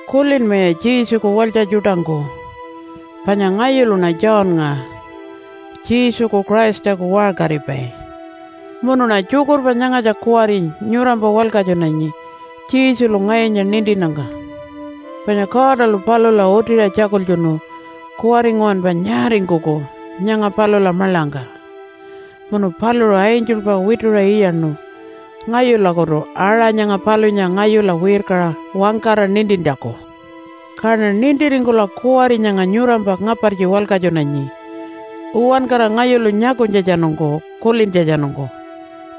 Kulinmaya Jesuku walytja tjuṯangku! Panya ngayuluṉa Johnnga, Jesuku Christaku waṟkaripai, munuṉa tjukurpa nyangatja kuwari nyurampa walkatjunanyi Jesulu ngayunya nintinnyangka. Panya Godalu palula utiṟa tjakultjunu kuwari nguwanpa nyaaringkuku nyanga palula maḻangka. Munu paluṟu angelpa wituṟa iyaṉu ngayulakutu aṟa nyanga palunya ngayula wirkaṟa wangkara nintintjaku. Kaṉa nintiringkula kuwari nyanga nyurampa ngapartji walkatjunanyi uwankara ngayulu nyakunytjatjanungku kulintjatjanungku,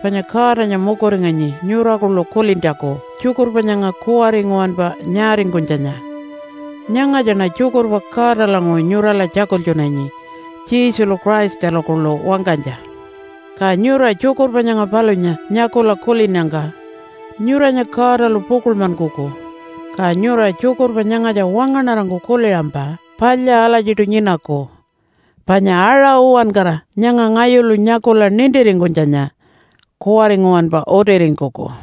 panya Godanya mukuringanyi nyura kuḻu kulintjaku tjukurpa nyanga kuwari nguwanpa nyaaringkunytjanya. Nyangatjaṉa tjukurpa Godalanguṟu nyurala tjakultjunanyi, Jesulu Christalu kuḻu wangkanytja. Ka nyura tjukurpa nyanga palunya nyakula kulinnyangka nyuranya Godalu pukuḻmankuku. Ka nyura tjukurpa nyangatja wangaṉarangku kuliṟampa palya alatjiṯu nyinaku. Panya aṟa uwankara nyanga ngayulu nyakula nintiringkunytjanya kuwari nguwanpa utiringkuku.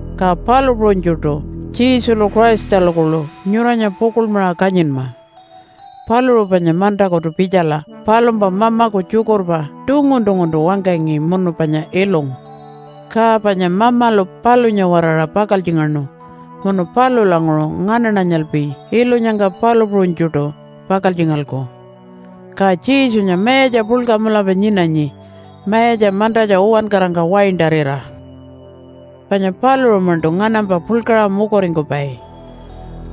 Ka palu puṟunytjuṯu Jesulu Christalu kuḻu nyuranya pukuḻmaṟa kanyinma. Paluṟu panya mantakutu pitjala palumpa mamaku tjukurpa tungun-tunguntu wangkangi munu panya ilungu. Ka panya Mamalu palunya-waraṟa pakaltjingaṉu munu palulanguṟu nganaṉanyalpi ilunyangka palu puṟunytjuṯu pakaltjingalku. Ka Jesunya mayatja puḻka mulapa nyinanyi mayatja mantatja uwankarangka waintarira. Panya paluṟu-maṉṯu nganampa puḻkaṟa mukuringkupai,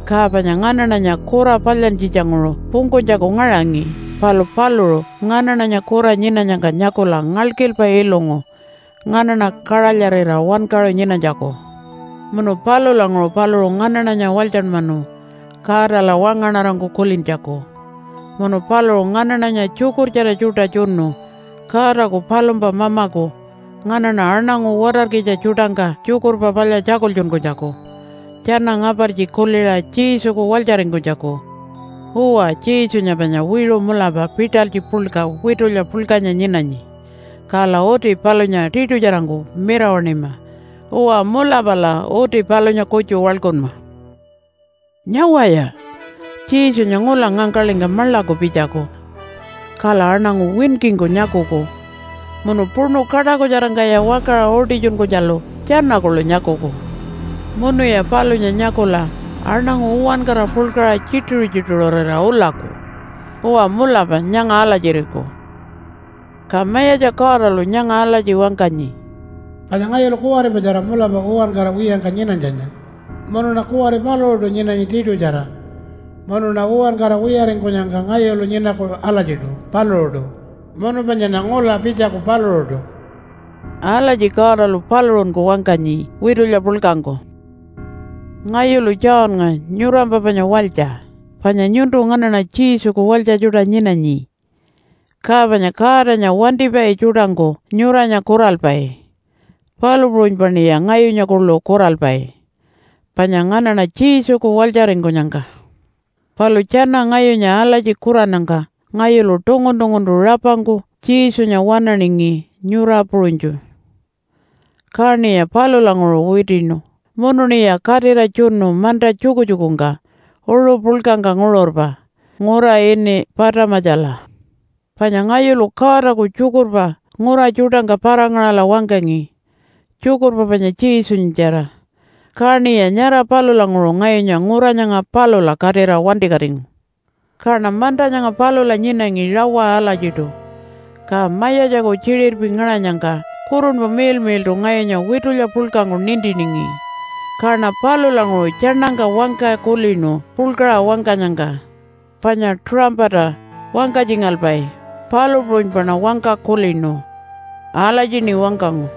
ka panya nganaṉanya kura palyantjitjanguṟu pungkunytjaku ngaṟangi palu paluṟu nganaṉanya kura nyinanyangka nyakula ngalkilpa ilungu nganaṉa kaṟalyarira wankaṟu nyinanytjaku. Munu palulanguṟu paluṟu nganaṉanya walytjanmanu Godala wangaṉarangku kulintjaku, munu paluṟu nganaṉanya tjukurtjara tjuṯa tjunu Godaku palumpa Mamaku nganaṉa aṉangu watarkitja tjuṯangka Tjukurpa Palya tjakultjunkunytjaku tjana ngapartji kuliṟa Jesuku walytjaringkunytjaku. Uwa, Jesunya panya wiṟu mulapa pitalytji puḻka witulya puḻkanya nyinanyi, kala uti palunya tiṯutjarangku mirawaṉima. Uwa, mulapala uti palunya kutju waḻkunma. Nyawaya! Jesunya ngula ngangkaḻingka maḻaku pitjaku, kala aṉangu winkingku nyakuku, munu puṉu kaṯakutjarangkaya wakaṟa utitjunkunytjalu tjana kuḻu nyakuku. Munuya palunya nyakula aṉangu uwankara puḻkaṟa tjituṟu-tjituṟurira ulaku. Uwa, mulapa nyanga alatjiriku. Ka Mayatja Godalu nyanga alatji wangkanyi, “Panya ngayulu kuwaripatjara mulapa uwankara wiyangka nyinanytjanya, munuṉa kuwari paluṟuṯu nyinanyi tiṯutjara, munuṉa uwankara wiyaringkunyangka ngayulu nyinaku alatjiṯu paluṟuṯu. Munu panyaṉa ngula pitjaku paluṟuṯu.” Alatji Godalu paluṟunku wangkanyi witulya puḻkangku. Ngayulu Johnnga, nyurampa panya walytja, panya nyuntu nganaṉa Jesuku walytja tjuṯa nyinanyi. Ka panya Godanya wantipai tjuṯangku nyuranya kuralpai, palu puṟunypaṉiya ngayunya kuḻu kuralpai, panya nganaṉa Jesuku walytjaringkunyangka. Palu tjana ngayunya alatji kurannyangka ngayulu tungun-tunguntu rapangku Jesunya waṉaningi nyura puṟunytju. Kaṉiya palulanguṟu witiṉu munuṉiya katira tjunu manta tjukutjukungka uṟu puḻkangka nguṟurpa ngura ini Patamatjala. Panya ngayulu Godaku tjukurpa ngura tjuṯangka para-ngaṟala wangkangi, tjukurpa panya Jesunyatjara. Kaṉiya nyara palulanguṟu ngayunya ngura nyanga palula katira wantikatingu. Kaṉa manta nyanga palula nyinangi rawa alatjiṯu, ka Mayatjaku tjiṟirpi ngaṟanyangka Kurunpa Miḻmiḻṯu ngayunya witulya puḻkangku nintiningi. Kaṉa palulanguṟu tjaṉangka wangka kulinu puḻkaṟa wangkanyangka, panya tuṟampata wangkatjingalpai, palu puṟunypaṉa wangka kulinu. Alatjiṉi wangkangu,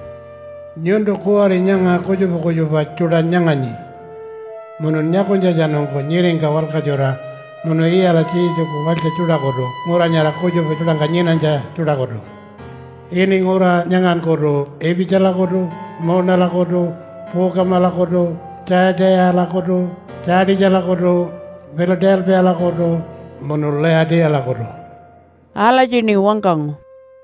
“Nyuntu kuwari nyanga kutjupa kutjupa tjuṯa nyanganyi, munun nyakunytjatjanungku nyiringka walkatjura munu iyala Jesuku walytja tjuṯakutu ngura nyara kutjupa tjuṯangka nyinanytja tjuṯakutu ini ngura nyangankutu Ipitjalakutu, Muunalakutu, Puukamalakutu, Tjayatiṟalakutu, Tjaatitjalakutu, Pila-talpiyalakutu, munu Layatiyalakutu.” Alatjiṉi wangkangu.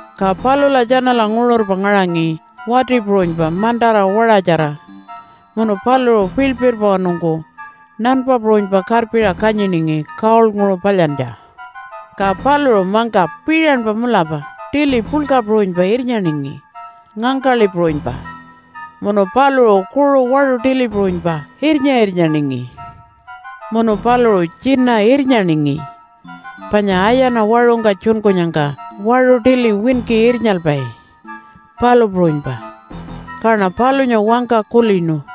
Ka palula tjanala nguṟurpa ngaṟangi wati puṟunypa mantara waṟatjara munu paluṟu piḻpirwanungku nanpa puṟunypa karpiṟa kanyiningi gold-nguṟu palyantja. Ka paluṟu mangka piṟanpa mulapa tili puḻka puṟunypa irnyaningi ngangkaḻi puṟunypa, munu paluṟu kuṟu waṟu tili puṟunypa irnya-irnyaningi. Munu paluṟu tjina irnyaningi, panya ayana waṟungka tjunkunyangka waṟu tili winki irnyalpai, palu puṟunypa. Kaṉa palunya wangka kulinu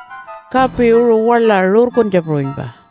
kapi uṟu waḻa rurkuntja puṟunypa.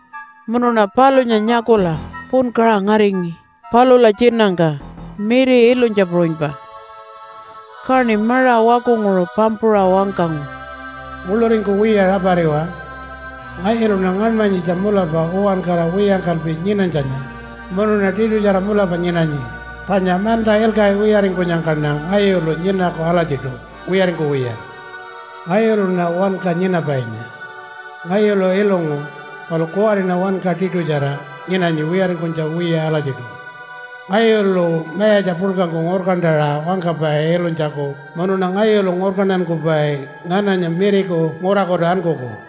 Munuṉa palunya nyakula punkaṟa ngaringi palula tjinangka miri ilunytja puṟunypa. Kaṉi maṟa wakunguṟu pampuṟa wangkangu, “Nguḻuringkuwiya rapariwa. Ngayuluṉa ngaṉmanyitja mulapa uwankara wiyangkalpi nyinanytjanya, munuṉa tiṯutjara mulapa nyinanyi panya manta ilkaṟi wiyaringkunyangkaṉa ngayulu nyinaku alatjiṯu wiyaringkuwiya. Ngayuluṉa Wanka Nyinapainya. Ngayulu ilungu palu kuwariṉa wanka tiṯutjara nyinanyi wiyaringkunytja wiya alatjiṯu. Ngayulu mayatja puḻkangku ngurkantaṟa wangkapai ilunytjaku munuṉa ngayulu ngurkantankupai ngananya miriku ngurakutu ankuku.